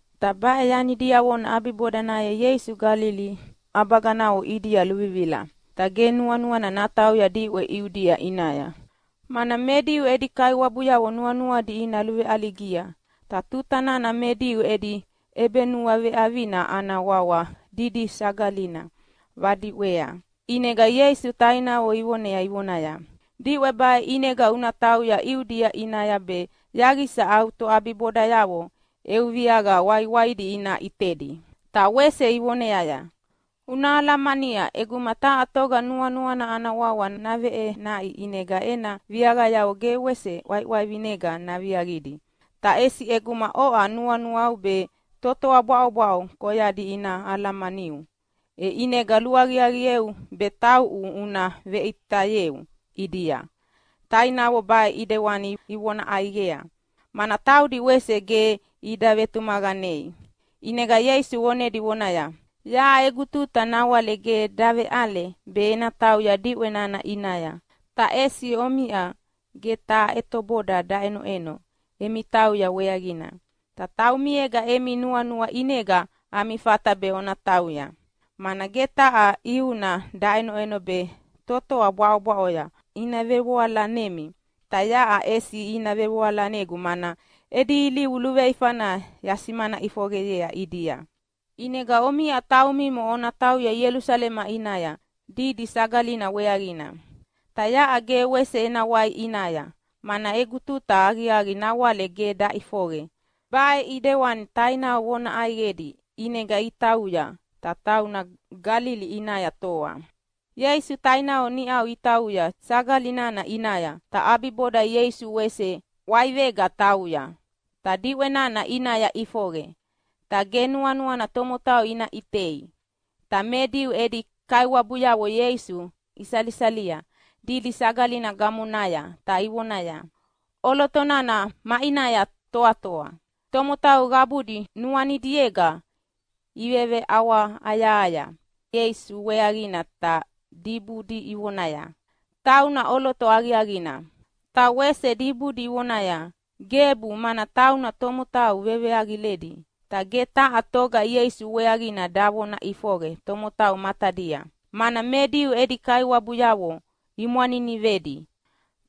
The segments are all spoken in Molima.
Ta baʼe yani diavona ʼabibodanaya Ieisu Galili ʼabaganavo ʼidia luvivila. Ta ge nuanuana natauya diʼwe Iudia ʼinaya, mana me Diu edi kaiwabuyavo nuanuadi ina luveʼaligia. Ta tuta nana me Diu edi ʼebenuaveʼavina ana wawa Didi Sagalina vadiʼwea, ʼinega Ieisu tainavo ivonea ivonaya, “Diʼwe baʼe ʼinega una tauya Iudia ʼinaya be yaqisa au toʼabibodayavo eu viaqa waiwaidi ina ʼitedi.” Ta wese ivoneaya, “Una alamania ʼeguma taha toga nuanuana ana wawa naveʼenaʼi ʼinega ena viaqayavo ge wese ʼwaiʼwaivinega naviaqidi, ta ʼesi ʼeguma oʼa nuanuau be totoa bwaʼobwaʼo koyadi ina alamaniu, e ʼinega luaqiaqieu be tauʼu una veʼitayeu ʼidia.” Tainavo baʼe ʼidewani ivona ʼaiqea, mana taudi wese ge ida vetumaqanei. ʼInega Ieisu vonedi vonaya, “Yaʼa egu tuta nawale ge daveʼale be ena tauya diʼwe nana ʼinaya, ta ʼesi omiʼa ge taha ʼetoboda daʼenoʼeno emi tauya weaqina, ta taumiega emi nuanua ʼinega ami fata be ona tauya. Mana ge taha ʼiuna daʼenoʼeno be totoa bwaʼobwaʼo ina vevoalanemi, ta yaʼa ʼesi ina vevoalanegu mana edi ilivu luveifana yasimana ʼifoqeyea ʼidia. ʼInega omiʼa taumimo ona tauya Ielusalema ʼinaya Didi Sagalina weaqina. Ta yaʼa ge wese ena wai ʼinaya, mana egu tuta aqiaqi nawale ge daʼifoqe.” Baʼe ʼidewani tainavo vona ʼaiqedi ʼinega itauya, ta tauna Galili ʼinaya toa. Ieisu tainavo niʼau itauya sagali nana ʼinaya. Ta ʼabiboda Ieisu wese ʼwaivega tauya, ta diʼwe nana ʼinaya ʼifoqe. Ta ge nuanuana tomotau ina ʼitei. Ta me Diu edi kaiwabuyavo Ieisu isalisalia Didi Sagalina gamonaya ta ivonaya, “ʼOloto nana maʼinaya toatoa?” Tomotau qabudi nuanidiega iveveʼawahayahaya Ieisu weaqina ta dibudi ivonaya, “Tauna ʼoloto aqiaqina!” Ta wese dibudi ivonaya, “Gebu, mana tauna tomotau veveaqiledi!” Ta ge taha toga Ieisu weaqina davona ʼifoqe tomotau matadia, mana me Diu edi kaiwabuyavo imwaninivedi.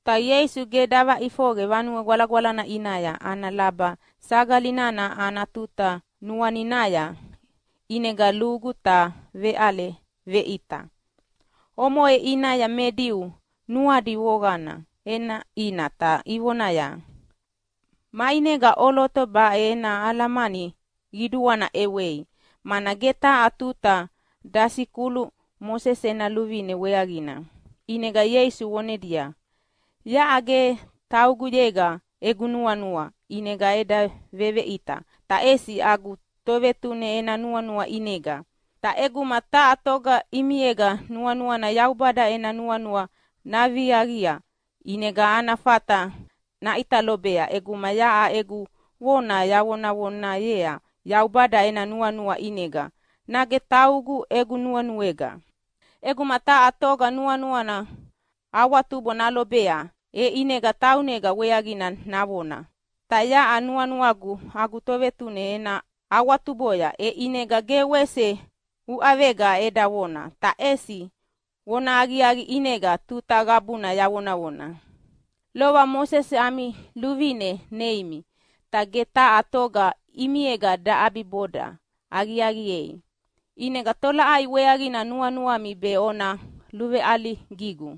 Ta Ieisu ge davaʼifoqe Vanue Gwalagwalana ʼinaya ana laba sagali nana ana tuta nuaninaya, ʼinega lugu ta veʼale veʼita. Omoʼe ʼinaya me Diu nuadi voqana ʼenaʼina ta ivonaya, “Maʼinega ʼoloto baʼe ena alamani qiduana ʼewei, mana ge taha tuta dasikulu Mosese ena luvine weaqina!” ʼInega Ieisu vonedia, “Yaʼa ge tauguyega egu nuanua ʼinega eda veveʼita, ta ʼesi agu Tovetune ena nuanua ʼinega. Ta ʼeguma taha toga ʼimiega nuanuana Yaubada ena nuanua naviaqia, ʼinega ana fata naʼita lobea ʼeguma yaʼa egu vona yavonavonayea Yaubada ena nuanua ʼinega nage taugu egu nuenuega. ʼEguma taha toga nuanuana awatubo nalobea, e ʼinega taunega weaqina navona. Ta yaʼa nuanuagu agu Tovetune ena awatuboya, e ʼinega ge wese uʼavega eda vona, ta ʼesi vonahaqiaqi ʼinega tuta qabuna yavonavona. “Lova Mosese ami luvine neimi, ta ge taha toga ʼimiega daʼabiboda aqiaqiei. ʼInega tolaʼai weaqina nuanuami be ona luveʼaligigu!”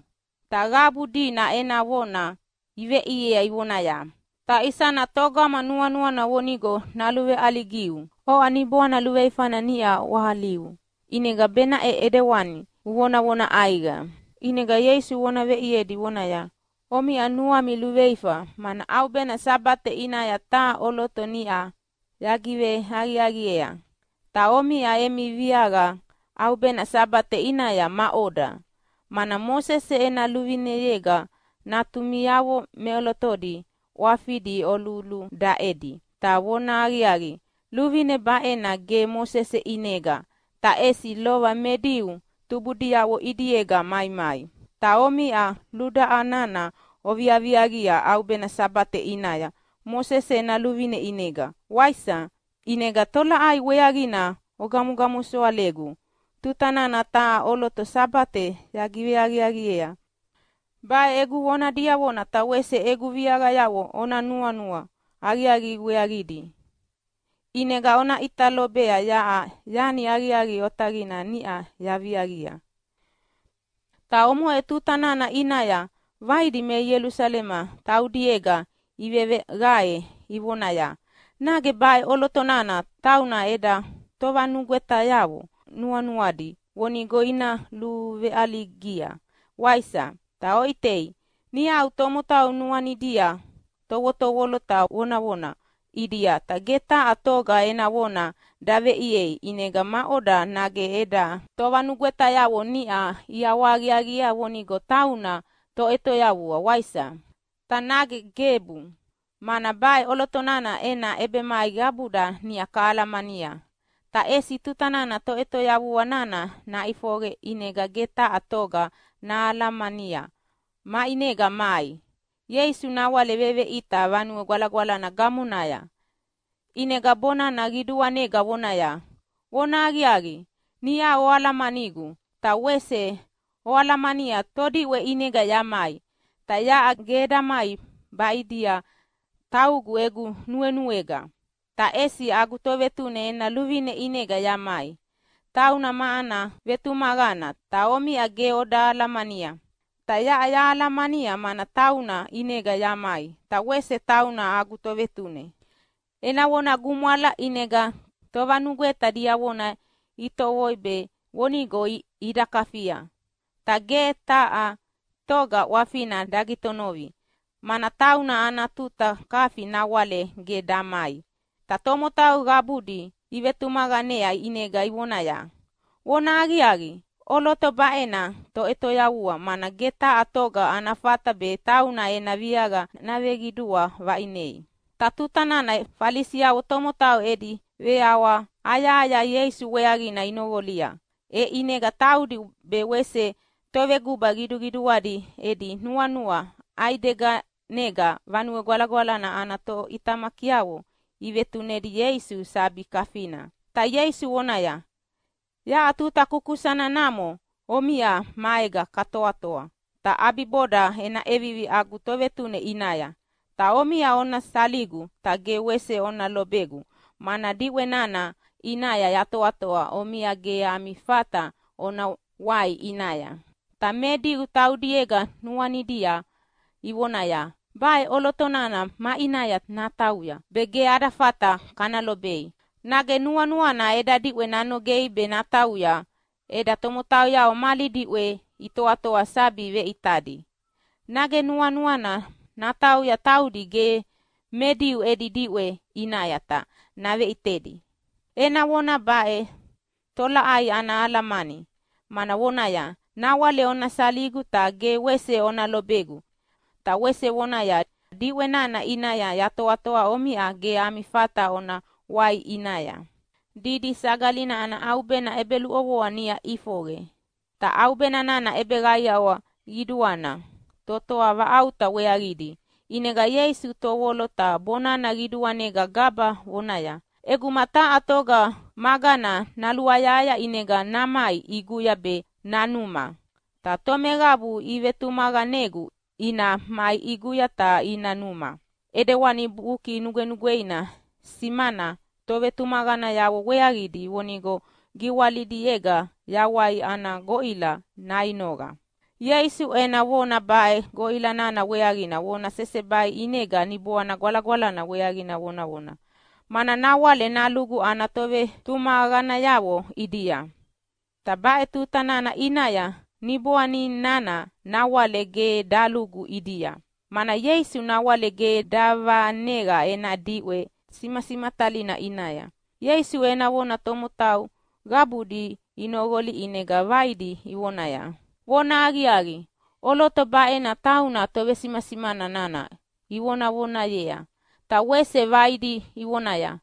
Ta qabu dina ena vona iveʼiea ivonaya, “Ta isana togama nuanuana vonigo naluveʼaligiu? Oʼa niboana luveifana niʼa ʼwahaliu, ʼinega benaʼe ʼidewani uvonavona ʼaiqa!” ʼInega Ieisu vona veʼiedi, vonaya, “Omiʼa nuami luveifa, mana ʼaubena Sabate ʼinaya taha ʼoloto niʼa yagiveaqiaqiea. Ta omiʼa emi viaqa ʼaubena Sabate ʼinaya maʼoda? Mana Mosese ena luvineyega natumiavo meʼolotodi ʼwafidi oluludaʼedi. (Ta vonahaqiaqi, luvine baʼena ge Mosese ʼinega, ta ʼesi lova me Diu tubudiavo ʼidiega maimai.) Ta omiʼa ludaʼa nana oviaviaqia ʼaubena Sabate ʼinaya Mosese ena luvine ʼinega, waisa? E ʼinega tolaʼai weaqina ogamosoalegu tuta nana taha ʼoloto Sabatea yagiveaqiaqiea? Baʼe egu vona diavona ta wese egu viaqayavo ona nuanua aqiaqi weaqidi, ʼinega ona ʼita lobea yaʼa yani aqiaqi otaqina niʼa yaviaqia.” Ta omoʼe tuta nana ʼinaya vaidi me Ielusalema taudiega iveveqae ivonaya, “Nage baʼe ʼoloto nana tauna eda tovanugwetayavo nuanuadi vonigo ina luveʼaligia, waisa? Ta oʼitei, niʼau tomotau nuanidia tovotovolo ta vonavona ʼidia ta ge taha toga ena vona daveʼiea. ʼInega maʼoda, nage eda tovanugwetayavo niʼa iʼawahaqiaqiea vonigo tauna Toʼetoyavua, waisa? Ta nage gebu, mana baʼe ʼoloto nana ena ʼebemai qabuda niʼa kahalamania, ta ʼesi tuta nana Toʼetoyavua nana naʼifoqe ʼinega ge taha toga nahalamania maʼinega mai.” Ieisu nawale veveʼita Vanue Gwalagwalana gamonaya, ʼinega bonana qiduanega vonaya, “Vonahaqiaqi, niʼau oalamanigu, ta wese oalamania todiʼwe ʼinega yamai. Ta yaʼa ge eda mai baʼidia taugu egu nuenuega, ta ʼesi agu Tovetune ena luvine ʼinega yamai. Tauna ma ana vetumaqana, ta omiʼa ge oda alamania. Ta yaʼa yahalamania, mana tauna ʼinega yamai, ta wese tauna agu Tovetune.” Ena vona gumwala, ʼinega tovanugweta diavona itovoi be vonigo ida kafia, ta ge taha toga ʼwafina dagitonovi, mana tauna ana tuta kafi nawale ge damai. Ta tomotau qabudi ivetumaqanea ʼinega ivonaya, “Vonahaqiaqi, ʼoloto baʼena Toʼetoyavua, mana ge taha toga ana fata be tauna ena viaqa naveqidua vaʼinei.” Ta tuta nana Falisiavo tomotau edi veʼawahayahaya Ieisu weaqina inoqolia, e ʼinega taudi be wese toveguba qiduqiduadi edi nuanua ʼaideganega Vanue Gwalagwalana ana toʼitamakiavo ivetunedi Ieisu sabi kafina. Ta Ieisu vonaya, “Yaʼa tuta kukusana namo omiʼa maega kana toatoa, ta ʼabiboda ena ʼevivi agu Tovetune ʼinaya. Ta omiʼa ona saligu, ta ge wese ona lobegu, mana diʼwe nana ʼinaya yatoatoa omiʼa ge ami fata ona wai ʼinaya.” Ta me Diu taudiega nuanidia ivonaya, “Baʼe ʼoloto nana maʼinaya natauya be ge ada fata kana lobei? Nage nuanuana eda diʼwe nanogei be natauya eda tomotauyavo mali diʼwea itoatoa sabi veʼitadi? Nage nuanuana natauya taudi ge me Diu edi diʼwe ʼinaya ta naveʼitedi? Ena vona baʼe tolaʼai ana alamani? Mana vonaya, ‘Nawale ona saligu ta ge wese ona lobegu’, ta wese vonaya, ‘Diʼwe nana ʼinaya yatoatoa omiʼa ge ami fata ona wai ʼinaya.’” Didi Sagalina ana ʼaubena ʼebeluʼovoa niʼa ʼifoqe, ta ʼaubena nana ʼebeqaiawa qiduana totoa vaʼauta weaqidi. ʼInega Ieisu tovolo ta bonana qiduanega gaba vonaya, “ʼEguma taha toga magana naluayahaya ʼinega namai ʼiguya be nanuma. Ta tomeqabu ivetumaqanegu ina mai ʼiguya ta ina numa, ʼidewani Buki Nugwenugweina simana tovetumaqanayavo weaqidi vonigo giwalidiega yawai ana goʼila nainoqa.” Ieisu ena vona baʼe goʼila nana weaqina vona sesebai ʼinega Niboana Gwalagwalana weaqina vonavona, mana nawale nalugu ana tovetumaqanayavo ʼidia. Ta baʼe tuta nana ʼinaya Niboani nana nawale ge dalugu ʼidia, mana Ieisu nawale ge davaneqa ena diʼwe simasimatalina ʼinaya. Ieisu ena vona tomotau qabudi inoqolia ʼinega vaidi ivonaya, “Vonahaqiaqi, ʼoloto baʼena tauna tovesimasimana nana ivonavonayea.” Ta wese vaidi ivonaya,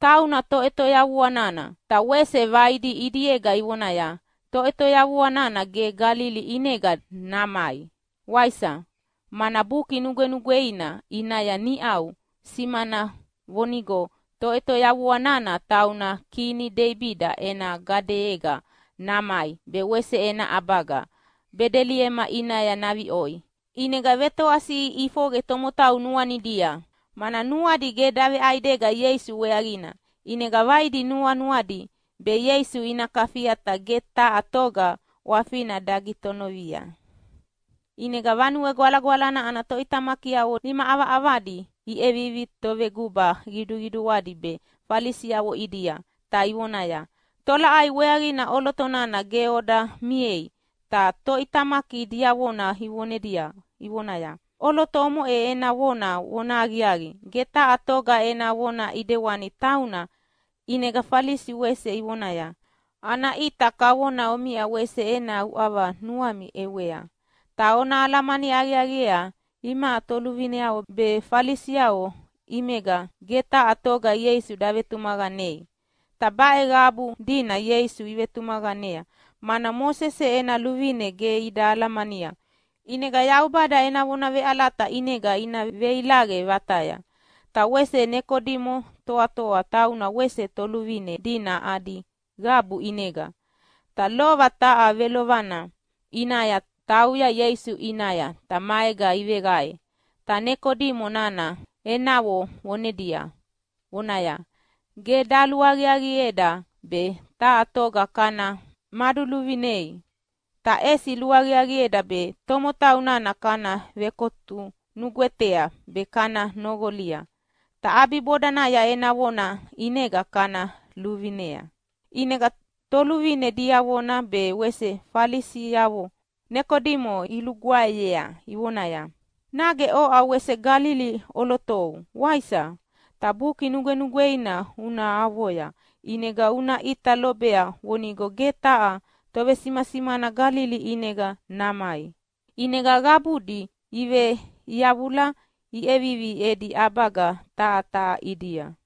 “Tauna Toʼetoyavua nana.” Ta wese vaidi ʼidiega ivonaya, “Toʼetoyavua nana ge Galili ʼinega namai, waisa? Mana Buki Nugwenugweina ʼinaya niʼau simana vonigo Toʼetoyavua nana tauna kini Deibida ena gadeyega namai be wese ena ʼabaga Bedeliema ʼinaya naviʼoi.” ʼInega vetoasiʼi ʼifoqe tomotau nuanidia, mana nuadi ge daveʼaidega Ieisu weaqina. ʼInega vaidi nuanuadi be Ieisu ina kafia ta ge taha toga ʼwafina dagitonovi. ʼInega Vanue Gwalagwalana ana toʼitamakiavo nima ʼavaʼavadi iʼevivi toveguba qiduqiduadi be Falisiavo ʼidia, ta ivonaya, “Tolaʼai weaqina ʼoloto nana ge oda miei?” Ta toʼitamaki diavona ivonedi ivonaya, “ʼOloto omoʼe ena vona vonahaqiaqi. Ge taha toga ena vona ʼidewani tauna!” ʼInega Falisiavo wese ivonaya, “Ana ʼita kavona omiʼa wese ena uʼava nuami ʼewea. Ta ona alamani aqiaqiea imaʼa toluvineavo be Falisiavo ʼimega ge taha toga Ieisu davetumaqanei. Ta baʼe qabu dina Ieisu ivetumaqanea, mana Mosese ena luvine ge ida alamania, ʼinega Yaubada ena vona veʼalata ʼinega ina veilaqe vataya.” Ta wese Nekodimo toatoa, tauna wese toluvine dina adi qabu ʼinega, ta lova taha velovana ʼinaya tauya Ieisu ʼinaya ta maega iveqae. Ta Nekodimo nana enavo vonedi, vonaya, “Ge daluaqiaqieda be taha toga kana maduluvinei, ta ʼesi luaqiaqieda be tomotau nana kana vekotu nugwetea be kana noqolia, ta ʼabibodanaya ena vona ʼinega kana luvinea.” ʼInega toluvine diavona be wese Falisiavo Nekodimo ilugwaeyea ivonaya, “Nage oʼa wese Galili ʼolotou, waisa? Ta Buki Nugwenugweina una avoya ʼinega una ʼita lobea vonigo ge taha tovesimasimana Galili ʼinega namai.” [ʼInega qabudi iveʼiyavula iʼevivi edi ʼabaga taha taha ʼidia.